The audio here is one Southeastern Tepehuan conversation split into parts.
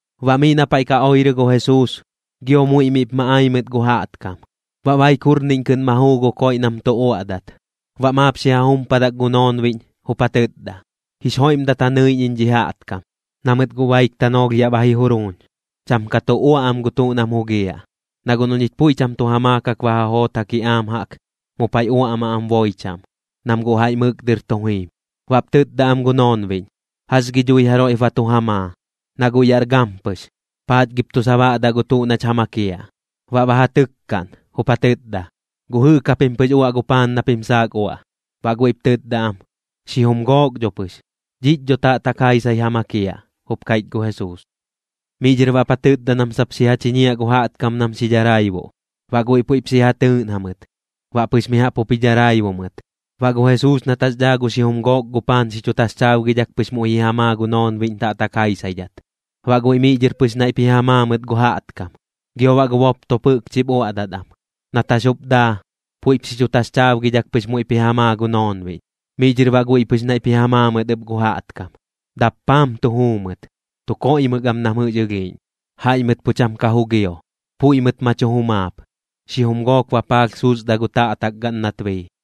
Baꞌ miꞌ na paiꞌ ka oirɨ gu Jesuus, gio muiꞌ miꞌp ma ai mɨt gu jaꞌtkam. Baꞌ baik jurniꞌñ kɨꞌn ma juu gu koiꞌ nam tu uaꞌdat. Baꞌ maap xi ja jumpadak gu noonbiꞌñ, jup ja tɨtda: ―Jix joiꞌmdat ja nɨiꞌñ iñ dhi jaꞌtkam, na mɨt guꞌ baik tanoolh yaꞌ ba ji juruuñ. Cham ka tu uaꞌ am gu tuꞌ nam jugiaꞌ. Na guꞌ noꞌ ñich puiꞌ cham tu ja maakak ba ja joot ja kiꞌaam jaꞌk, mu paiꞌ uaꞌmaꞌ am boi chaꞌm, nam guꞌ jaiꞌ mɨk dɨr tu jim. Baꞌp tɨtda am gu noonbiꞌñ: ―¿Jax gi dhui jaroiꞌp ba tu ja maa, na guꞌ yaꞌr gampɨx? ¿Paach gip tu sabaꞌdaꞌ gu tuꞌ nach ja makiaꞌ? Baꞌ ba ja tɨkkaꞌn, jup ja tɨtda: ―¿Guꞌ jɨꞌk japim pɨx uaꞌ gu paan na pim saak uaꞌ? Baꞌ guiꞌp tɨtda am: ―Xijum gook dho pɨx. ―Dhiꞌch dho taꞌtak jaisai ja makiaꞌ ―jup kaiꞌch gu Jesuus. Miꞌ dhɨr baꞌp ja tɨtda nam sap xi ja chiñiaꞌ gu jaꞌtkam nam xi dharaibuꞌ. Baꞌ guiꞌ puiꞌp xi ja tɨɨꞌn jamɨt, baꞌ pɨx mi jaꞌp jup ji dharaibu mɨt. Baꞌ gu Jesuus nat jax dhaa gu xijum gook gu paan xi chu taxchaabgidhak pɨx muiꞌ ji ja maa gu noonbiꞌñ taꞌtak jaisaidhat, baꞌ guiꞌ miꞌ dhɨr pɨx naiꞌp ji ja maa mɨt gu jaꞌtkam. Gio baꞌ gu boptop jɨꞌkchip uaꞌdat am. Nat jax jup daa, puiꞌp xi chu taxchaabgidhak pɨx muiꞌp ji ja maa gu noonbiꞌñ, miꞌ dhɨr baꞌ guiꞌ pɨx naiꞌp ji ja maa mɨt ɨp gu jaꞌtkam. Dappaam tu juu mɨt, tu koiꞌmɨk am nam jɨꞌx ɨlhiiꞌñ. Jaiꞌ mɨt pu cham ka jugio, puiꞌ mɨt ma chu jumaap, xijum gook bapaalh susda gu taꞌtak gaꞌn nat bii.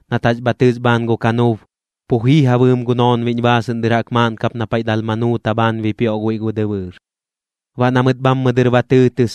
nat jax bha tɨs bhaan gu kanuub, pu jii ja bɨɨm gu noonbiꞌñ baasɨꞌn dɨr jaꞌk maaꞌn kap na paiꞌ Dalmanuuta bhaan bipioꞌ guiꞌ gu dɨbɨɨr. Baꞌ na mɨt bhammɨ dɨr ba tɨɨtɨs,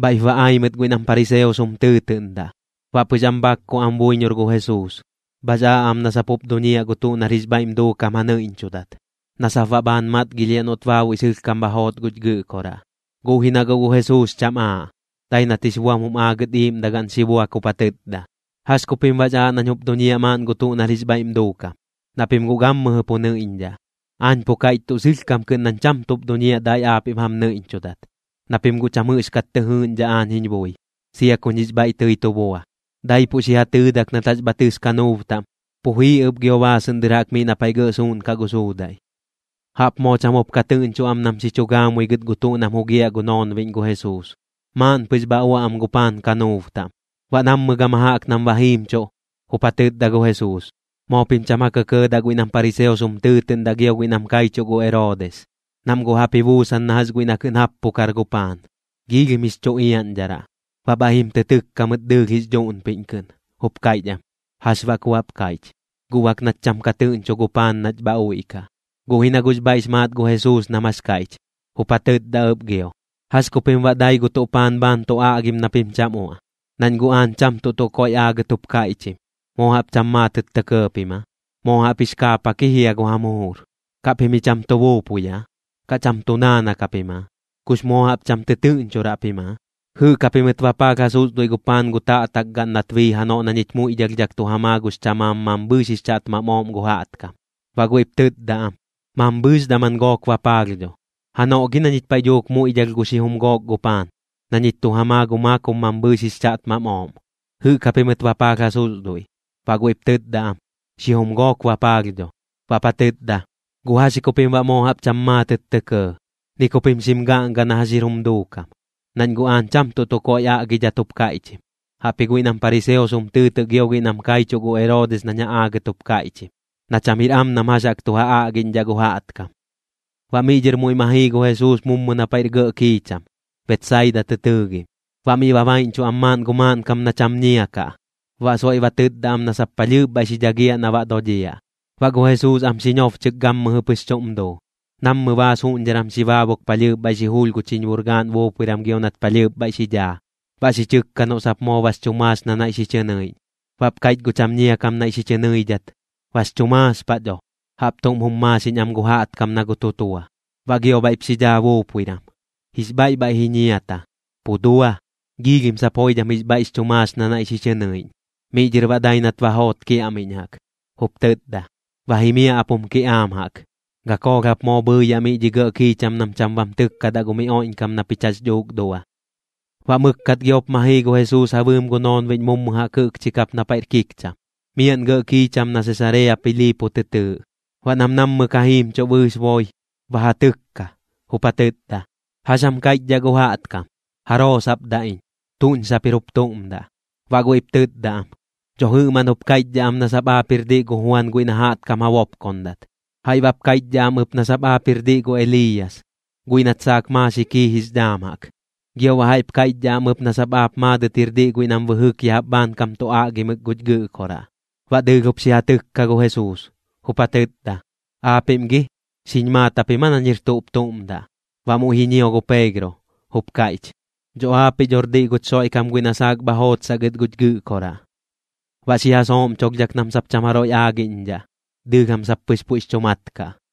bhaiꞌp ba ai mɨt guiꞌ nam pariseos jum tɨɨtɨꞌndaꞌ. Baꞌ pɨx am bhakku am buiñor gu Jesuus, bhax aaꞌ am na sap jup duñiaꞌ gu tuꞌ nar jix bhaiꞌm duukam ja nɨiꞌñchudat, na sap baꞌ bhaan matgilhiaꞌ noꞌt baabuiꞌ sɨlhkam bha joot guch Gɨꞌkoraꞌ. Guꞌ ji na guꞌ gu Jesuus cham aaꞌ, dai nat jix buam jum aagɨt iiꞌmdagaꞌn xi buak jup ja tɨtda: ―¿Jax ku pim baꞌx aaꞌ nañ jup duñiaꞌ maaꞌn gu tuꞌ nar jix bhaiꞌm duukam? Na pim guꞌ gammɨjɨ pu nɨiꞌñdhaꞌ. Aañ pu kaiꞌch tuꞌ sɨlhkam kɨꞌn nañ cham tuꞌp duñiaꞌ dai aapiꞌm jam nɨiꞌñchudat, na pim guꞌ cham jɨꞌxkat tɨ jɨɨꞌñdhaꞌ aañ jiñ bui, sia kuñ jix bhaiꞌ tɨi tu bua. Daipuꞌ xi ja tɨɨdak nat jax bha tɨs kanuub taꞌm, pu jii ɨp gio baasɨꞌn dɨr jaꞌk miꞌ na paiꞌ gɇꞌ suuꞌnkaꞌ gu suudaiꞌ. Jaꞌp moo cham jup ka tɨꞌñchuꞌ am nam xi chu gaamui gɨt gu tuꞌ nam tu jugiaꞌ gu noonbiꞌñ gu Jesuus, maaꞌn pɨx bha uaꞌ am gu paan kanuub taꞌm. Baꞌ nammɨ gama jaꞌk nam ba jiimchuꞌ, jup ja tɨtda gu Jesuus: ―Moo pim cham ja kɇkɇɇdaꞌ guiꞌ nam pariseos jum tɨɨtɨꞌndaꞌ gio guiꞌ nam kaichuꞌ gu Eroodis. Nam guꞌ jaꞌp ji buusan na jax guiꞌ na kɨꞌn jappukar gu paan, giilhim jix chu iaꞌñdharaꞌ. Baꞌ bhaiꞌ jim tɨ tɨkka mɨt dɨɨlh jix dhuꞌnpiꞌñ kɨꞌn, jup kaiꞌch am: ―¿Jax baꞌ ku baꞌp kaiꞌch? Guꞌ bak nach cham ka tɨꞌñchu gu paan nach bha uiꞌkaꞌ. Guꞌ ji na guꞌx bhaiꞌx maat gu Jesuus nam jax kaiꞌch, jup ja tɨtda ɨp gio: ―¿Jax ku pim baꞌ dai gu tuꞌ paan bhaan tu aꞌgim na pim cham uaꞌ? Nañ guꞌ aañ cham tuꞌ tuꞌ koiꞌ aagɨt jup kaiꞌchim. ¿Moo jaꞌp cham maatɨt tɇ kɇɇ pim aa? ¡Moo jaꞌp jix kaapak ji jia gu jam jujur! ¿Kaꞌ pim ji cham tu buupui aa, kaꞌ cham tu naanak japim aa? ¿Kux moo jaꞌp cham tɨtɨꞌñchuraꞌ pim aa? ¿Jɨꞌk japimɨt bapaalh ja susduiꞌ gu paan gu taꞌtakgaꞌn nat bii janoꞌ na ñich muiꞌdhalhdhak tu ja maa gux chamaam mambhɨɨx jix chaꞌtmam ooꞌm gu jaꞌtkam? Baꞌ guiꞌp tɨtda am: ―Mambhɨɨx daman gook bapaalh dho. ―Janoꞌ gi na ñich paiꞌ dhuuk muiꞌdhalh gu xijum gook gu paan, na ñich tu ja maa gu maakob mambhɨɨx jix chaꞌtmam ooꞌm, ¿jɨꞌk japimɨt bapaalh ja susduiꞌ? Baꞌ guiꞌp tɨtda am: ―Xijum gook bapaalh dho. Baꞌp ja tɨtda: ―¿Guꞌ jax ji ku pim baꞌ moo jaꞌp cham maatɨt tɇ kɇɇ, ni ku pim xim gaꞌnga na jax jir jum duukam? Nañ guꞌ aañ cham tuꞌ tuꞌ koiꞌ aꞌgidhat jup kaiꞌchim, jaꞌpji guiꞌ nam pariseos jum tɨɨtɨꞌ gio guiꞌ nam kaichuꞌ gu Eroodis nañ ja aagɨt jup kaiꞌchim, na cham jir am nam jax jaꞌk tu ja aꞌgiꞌñdhaꞌ gu jaꞌtkam. Baꞌ miꞌ dhɨr muiꞌ ma jii gu Jesuus mummu na paiꞌr gɇꞌ kiicham, Betsaida tɨ tɨɨgim. Baꞌ miꞌ ba baiꞌñchuꞌ am maaꞌn gu maaꞌnkam na cham ñia kaꞌ, baꞌ soiꞌ ba tɨtda am na sap palhɨɨp bhaiꞌ xi dhagiaꞌ na baꞌ dodhiaꞌ. Baꞌ gu Jesuus am xi ñobchɨk gammɨjɨ pɨx chuꞌm duu, nammɨ baas juꞌñdharan xi baabuk palhɨɨp bhaiꞌ xi julh gu chiñbur gaꞌn buupuiran gio nat palhɨɨp bhaiꞌ xi dhaa, baꞌ xi chɨkka noꞌ sap moo bax chu maax na naiꞌ xi chɨ nɨiꞌñ. Baꞌp kaiꞌch gu cham ñia kam naiꞌ xi chɨ nɨidhat: ―Bax chu maax paꞌ dho. Jaꞌp tuꞌm jum maaxiꞌñ am gu jaꞌtkam na gu tutua. Baꞌ gio bhaiꞌp xi dhaa buupuiran, jix bhaiꞌ bhaiꞌ ji ñiata, pu dua, sap joidham jix bhaiꞌx chu maax na naiꞌ xi chɨ nɨiꞌñ. Miꞌ dhɨr baꞌ dai nat ba joot kiaꞌmiꞌñ jaꞌk, jup tɨtda: ―Ba jimiaꞌ ap jum kiꞌaam jaꞌk. Gakoolh jap moo bhɨɨyaꞌ miꞌ dhi gɇꞌ kiicham nam cham bam tɨkkadaꞌ gu miꞌ oiꞌñkam na pich jax dhuuk dua. Baꞌ mɨkkat giop ma jii gu Jesuus ja bɨɨm gu noonbiꞌñ mummu jaꞌk jɨꞌkchi kap na paiꞌr kikcham, miaꞌn gɇꞌ kiicham na Sesarea Piliipo tɨ tɨɨꞌ. Baꞌ nam nammɨ ka jimchuꞌ bɨɨx boi, ba ja tɨkka, jup ja tɨtda: ―¿Jax jam kaiꞌchdhaꞌ gu jaꞌtkam? ¿Jaroo sap daꞌ iñ? ¿Tuꞌñ sap jir jup tuꞌm daꞌ? Baꞌ guiꞌp tɨtda am: ―Dho jɨꞌmaꞌn jup kaiꞌchdhaꞌ am nap sap aap jir diꞌ gu Juan guiꞌ na jaꞌtkam ja bopkondat. Jaiꞌ baꞌp kaiꞌchdhaꞌ am ɨp nap sap aap jir diꞌ gu Eliiyas, guiꞌ nat saak maaxik jii jix dhaam jaꞌk. Gio baꞌ jaiꞌp kaiꞌchdhaꞌ am ɨp nap sap aap maadɨt jir diꞌ guiꞌ nam bɨjɨk ya jaꞌp bhaankam tu aꞌgimɨk guch Gɨꞌkoraꞌ. Baꞌ dɨɨlh jup xi ja tɨkka gu Jesuus, jup ja tɨtda: ―Aapiꞌm gi, ¿xiñ maat japim aa nañ jir tuꞌp tuꞌm daꞌ? Baꞌ muiꞌ ji ñio gu Peegro, jup kaiꞌch: ―Dho aapiꞌ dhor diꞌ guch Xoiꞌkam guiꞌ na saak bha jootsaꞌ gɨt guch Gɨꞌkoraꞌ. Baꞌ xi ja sooꞌmcholhdhak nam sap cham jaroiꞌ aagiꞌñdhaꞌ, dɨɨlh jam sap pɨx puiꞌx chu mat kaꞌ.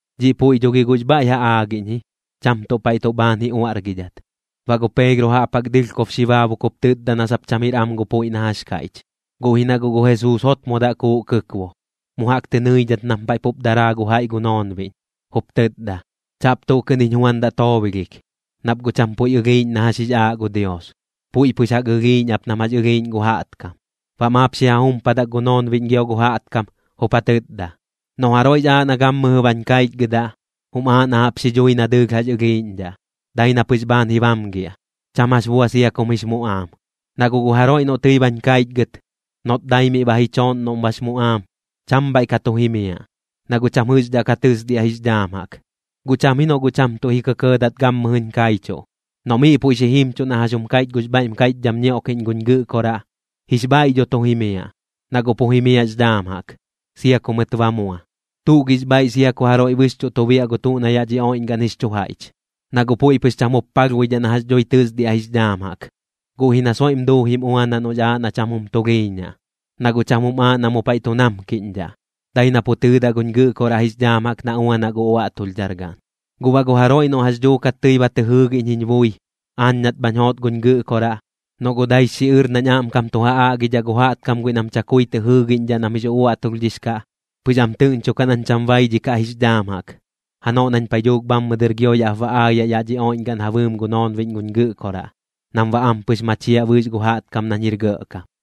Dhiꞌ puiꞌ dho gi guꞌx bhaiꞌ ja aagiꞌñ ji, cham tuꞌ paiꞌ tuꞌ bhaan ji uaꞌrgidhat. Baꞌ gu Peegro jaꞌp jaꞌk dɨlhkob xi baabuk jup tɨtda na sap cham jir am gu puiꞌ na jax kaiꞌch. Guꞌ ji na guꞌ gu Jesuus jotmodaꞌ kuuꞌ kɨkbu, mu jaꞌk tɨ nɨidhat nam paiꞌ pup daraa gu jaiꞌ gu noonbiꞌñ, jup tɨtda: ―¡Chaꞌp tuꞌ kɨꞌn jiñ juandaꞌ toobolhik! Nap guꞌ cham puiꞌ ɨlhiiꞌñ na jax jix aaꞌ gu Dios. Puiꞌ pɨx jaꞌk ɨlhiiꞌñ ap nam jax ɨlhiiꞌñ gu jaꞌtkam. Baꞌ maap xi ja jumpadak gu noonbiꞌñ gio gu jaꞌtkam, jup ja tɨtda: ―Noꞌ jaroiꞌx aaꞌ na gammɨjɨ bañ kaichgɨdaꞌ, jum aaꞌ na jaꞌp xidhui na dɨɨlh jax ɨlhiiꞌñdhaꞌ, dai na pɨx bhaan ji bamgiaꞌ, cham jax bua sia kum jix muꞌaam. Na guꞌ gu jaroiꞌ noꞌ tɨi bañ kaichgɨt, noꞌt dai miꞌ ba ji chooꞌn noꞌm bax muꞌaam, cham bhaiꞌ ka tu jimiaꞌ, na guꞌ cham jɨꞌxdhaꞌ ka tɨsdiaꞌ jix dhaam jaꞌk. Guꞌ cham ji noꞌ guꞌ cham tuꞌ ji kɇkɇɇdat gammɨjɨñ kaichuꞌ, noꞌ miꞌ puiꞌ xi jimchuꞌ na jax jum kaiꞌch gux bhaiꞌm kaiꞌchdham ñioꞌkiꞌñ guñ Gɨꞌkoraꞌ, jix bhaiꞌ dho tu jimiaꞌ, na guꞌ pu jimiaꞌx dhaam jaꞌk, sia ku mɨt ba mua. ¿Tuꞌ gix bhaiꞌ sia ku jaroiꞌ bɨxchuꞌ tu biaꞌ gu tuꞌ na yaꞌ dhi oiꞌñgaꞌn jix chu jaiꞌch? Na guꞌ puiꞌ pɨx cham jup palhbuidhaꞌ na jax dhui tɨsdiaꞌ jix dhaam jaꞌk, guꞌ ji na soiꞌm duujim uanaꞌ noꞌx aaꞌ na cham jum tulhiiñaꞌ. Na guꞌ cham jum aaꞌ na mu paiꞌ tu namkiꞌñdhaꞌ, dai na pu tɨɨdaꞌ guñ Gɨꞌkoraꞌ jix dhaam jaꞌk na uanaꞌ gu uaꞌtulhdhar gaꞌn. Guꞌ baꞌ gu jaroiꞌ noꞌ jax dhuukat tɨi ba tɨ jɨɨgiꞌñ jiñ bui, aañ nat bhañ joot guñ Gɨꞌkoraꞌ, noꞌ guꞌ daix xiꞌɨr nañ aꞌmkam tu ja aꞌgidhaꞌ gu jaꞌtkam guiꞌ nam chakui tɨ jɨɨgiꞌñdhaꞌ nam jix uaꞌtulhdhix kaꞌ, pɨx am tɨꞌñchukaꞌ nañ cham baidhikaꞌ jix dhaam jaꞌk, janoꞌ nañ paiꞌ dhuuk bhammɨ dɨr gio yaꞌp ba aayaꞌ yaꞌ dhi oiꞌñgaꞌn ja bɨɨm gu noonbiꞌñ guñ Gɨꞌkoraꞌ, nam baꞌ ampɨx machiaꞌ bɨɨx gu jaꞌtkam nañ jir gɇꞌkam.